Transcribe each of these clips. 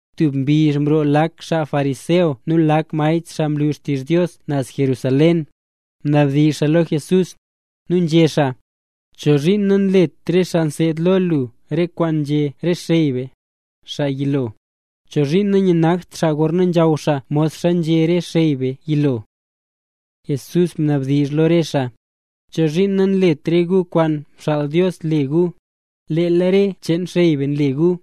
Tub mbizh mroo lak xaa fariseo nu lak maestr xaa nlu xtizh Dios naz Jerusalén, mnabdizh lo Jesús, nu nzhé xaa: —¿Chozhiin nanlet re xaa nseed lo lu re kwaan nzhé re xey be, xaa yilo? ¿Chozhiin nayanagt xaa gorna nzhaw xaa modxa nzhé re xey be yilo? Jesús mnabdizh lo re xaa: —¿Chozhiin nanlet re gu kwaan mxaal Dios le gu, leel re cheen xey be nle gu?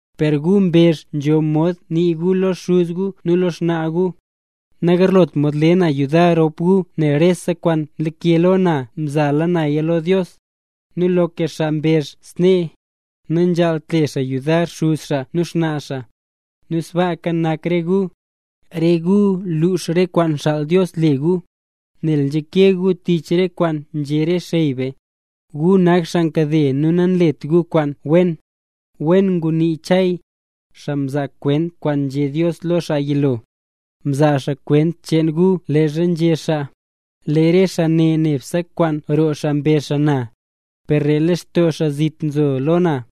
Per gu mbezh nzho mod nii gu lo xuz gu nu lo xnaa gu: “Nagarlot mod le na yudar rop gu, nel rese kwaan mlake lo na mzala naya lo Dios”. Nu loka xaa mbezh snee, nanzhaalt le xaa yudar xuz xaa nu xnaa xaa. Nu sbaaka nak re gu, re gu nlux re kwaan mxaal Dios le gu, nel nzhake gu tich re kwaan nzhé re xey be. ¡Gu nak xaa nkade nu nanlet gu kwaan wen! Wen ngunii Chay, xaa mzaa kwent kwaan nzhé Dios lo lee xaa yilo. Mzaa xaa kwent cheen gu leezha nzhé xaa: Lee re xaa ne nebse kwaan roo xaa mbezh na, per lee lextoo xaa zit doo nzo lo na.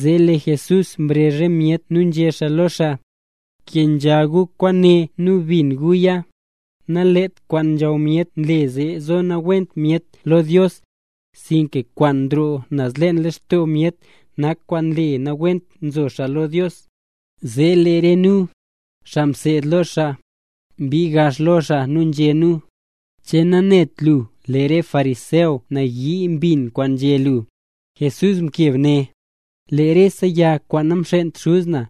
Zee lee Jesús mrezh re myet nu nzhé xaa lo re xaa: —Kenzha gu kwaane nu bin guya. Nalet kwaan nzhaw myet nle nzo nawent myet lo Dios, sinka kwaan nroo naz leen lextoo myet nak kwaan nle nawent nzo xaa lo Dios. Zee lee re nu, xaa mseed lo xaa, mbii gax lo xaa nu nzhé nu: —¿Che nanet lu lee re fariseo nayii mbin kwaan nzhé lu? Jesús mkeb né: —Lee rese yag kwaan namxent Xuz na,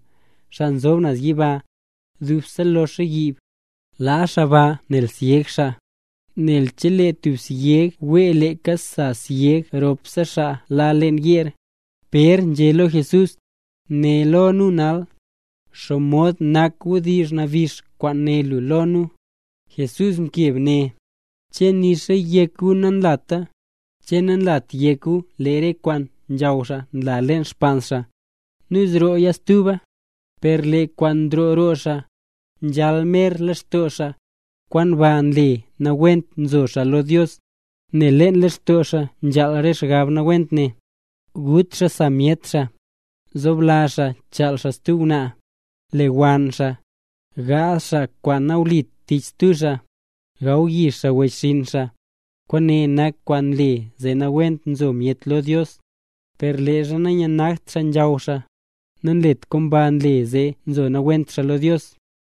xaa nzob naz yiba, dub loxa yiib. Laa xaa ba nel syeg xaa, nel chelee tub syeg wee leeka sasyeg syeg ropse xaa la leen yeer. Pér nzhé lo Jesús: —Né lo nu nal, ¿xomod nak wdizh nabix kwaan nguné lu lo nu? Jesús mkeb né: —¿Che nixa yek gu nanlata? ¿Che nanlat yek gu, lee rese kwaan nzhaw xaa nla leen xpaans xaa, nu nrooya stuba? Per lee kwaan nroo roo xaa, nzhal mer lextoo xaa, kwaan ba nle nawent nzo xaa lo Dios. Nel leen lextoo xaa nzhal re xgab nawent ne: gut xaa sa myet xaa, zoblazh xaa chaal xaa stub ngwnaa, lewann xaa, gaazh xaa kwaan nawlit tich stub xaa, gawyix xaa wechxinn xaa. Kwaane nak kwaan nle zee nawent nzo myet lo Dios. Per leezha nanyanagt xaa gaw xaa, nanlet kwaan ba nle zee nzo nawent xaa lo Dios.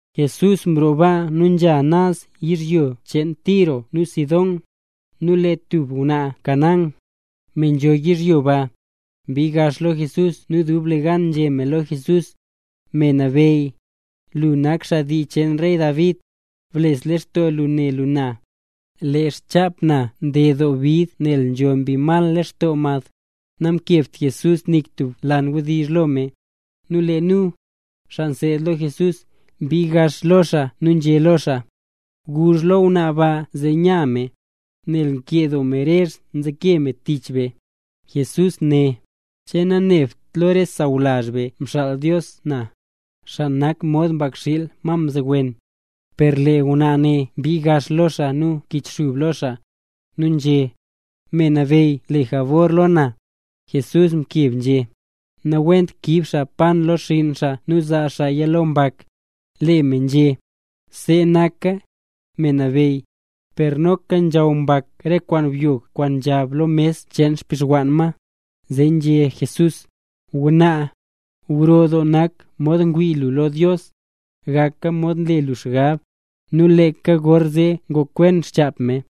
Jesús mroo baa nu nzha naz yizhyo cheen Tiro nu Sidón. Nu lee tub ngwnaa Canaán, me nzho yizhyo ba, mbii gax lo Jesús nu dublegan nzhé me lo Jesús: —Me Nabeyy, lu nak xaa dii cheen rey David, bles lextoo lu ne lu na. Lee xchap na nded doo bid nel nzho mbi mal lextoo mad. Namkebt Jesús nik tub lan wdizh lo me. Nu lee nu, xaa mseed lo Jesús, mbii gax lo xaa nu nzhé nu lo xaa: —Guzh lo ngwnaa ba zee nya me, nel nkee doo me rezh nzeke me tich be. Jesús né: —¿Che nanebt lo re sawlazh be mxaal Dios na, re xaa nak mod mbakxiil ma mzowen? Per lee ngwnaa ne mbii gax lo xaa nu mkichxub lo xaa, nu nzhé: —Me Nabeyy, le jabor lo na. Jesús mkeb nzhé: —Nawent kiib xaa pan lo xinn xaa nu zaa xaaya lo mbak. Lee me nzhé: —See naka, Me Nabeyy. Per noka nzhaw mbak re kwaan byog kwaan nzhab lo mes cheen xbixwann ma. Zee nzhé Jesús: —Ngwnaa, gro doo nak mod ngwii lu lo Dios. Gaka mod nle lu xgab. Nu leeka gorzee ngokwen xchap me.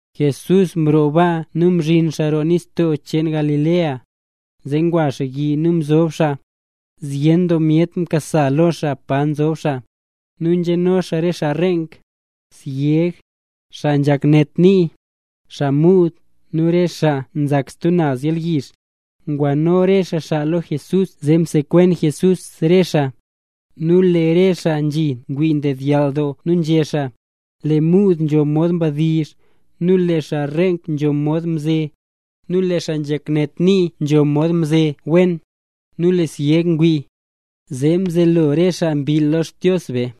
Jesús mroo baa nu mzhin xaa roo nistoo cheen Galilea. Zee ngwa xaa yi nu mzob xaa. Zyen doo myet nkasa lo xaa pa nzob xaa. Nu nzheno re xaa xaa reenk, syeg, xaa nzhak net nii, xaa muud, nu re xaa nzak stub naz yalyizh. Ngwano re xaa xaa lo Jesús zee msekwen Jesús re xaa. Nu lee re xaa nzhi ngwii mdedyall doo nu nzhé xaa: —Lee muud nzho mod nzhadizh, nu lee xaa reenk nzho mod nze, nu lee xaa nzhak net nii nzho mod nze wen, nu lee syeg ngwii. Zee mzelo re xaa mbill lo Xdios be.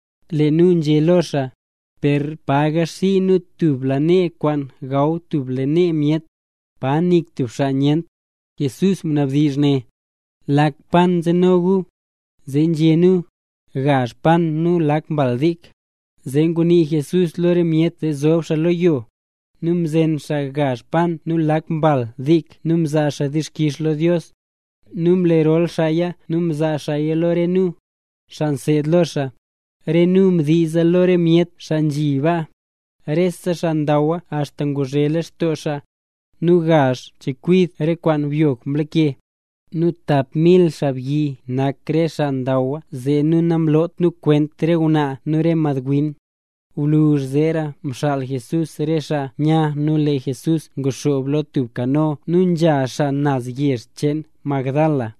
Lee nu nzhé lo xaa: —¿Per pa yixii nu tub lanee kwaan gaw tub lanee myet, pa nik tub xaa nyent? Jesús mnabdizh né: —¿Lak pan nzeno gu? Zee nzhé nu: —Gazh pan nu lak mbal dik. Zee ngunii Jesús lo re myet zee zob xaa lo yo. Nu mzen xaa gazh pan nu lak mbal dik nu mzaa xaa dixkix lo Dios. Nu mlerol xaaya nu mzaa xaaya lo re nu, xaa mseed lo xaa. Re nu mdiiza lo re myet xaa nzhi baa. Rese xaa ndaw axta nguzhe lextoo xaa. Nu gazh chekwid re kwaan byog mlake. Nu tap mil xaabyi nak re xaa ndawa zee nu namloot nu kwent re ngwnaa nu re madwin. Gwluzh zeera mxaal Jesús re xaa nya nu lee Jesús nguxoob lo tub kano nu nzha xaa naz yezh cheen Magdala.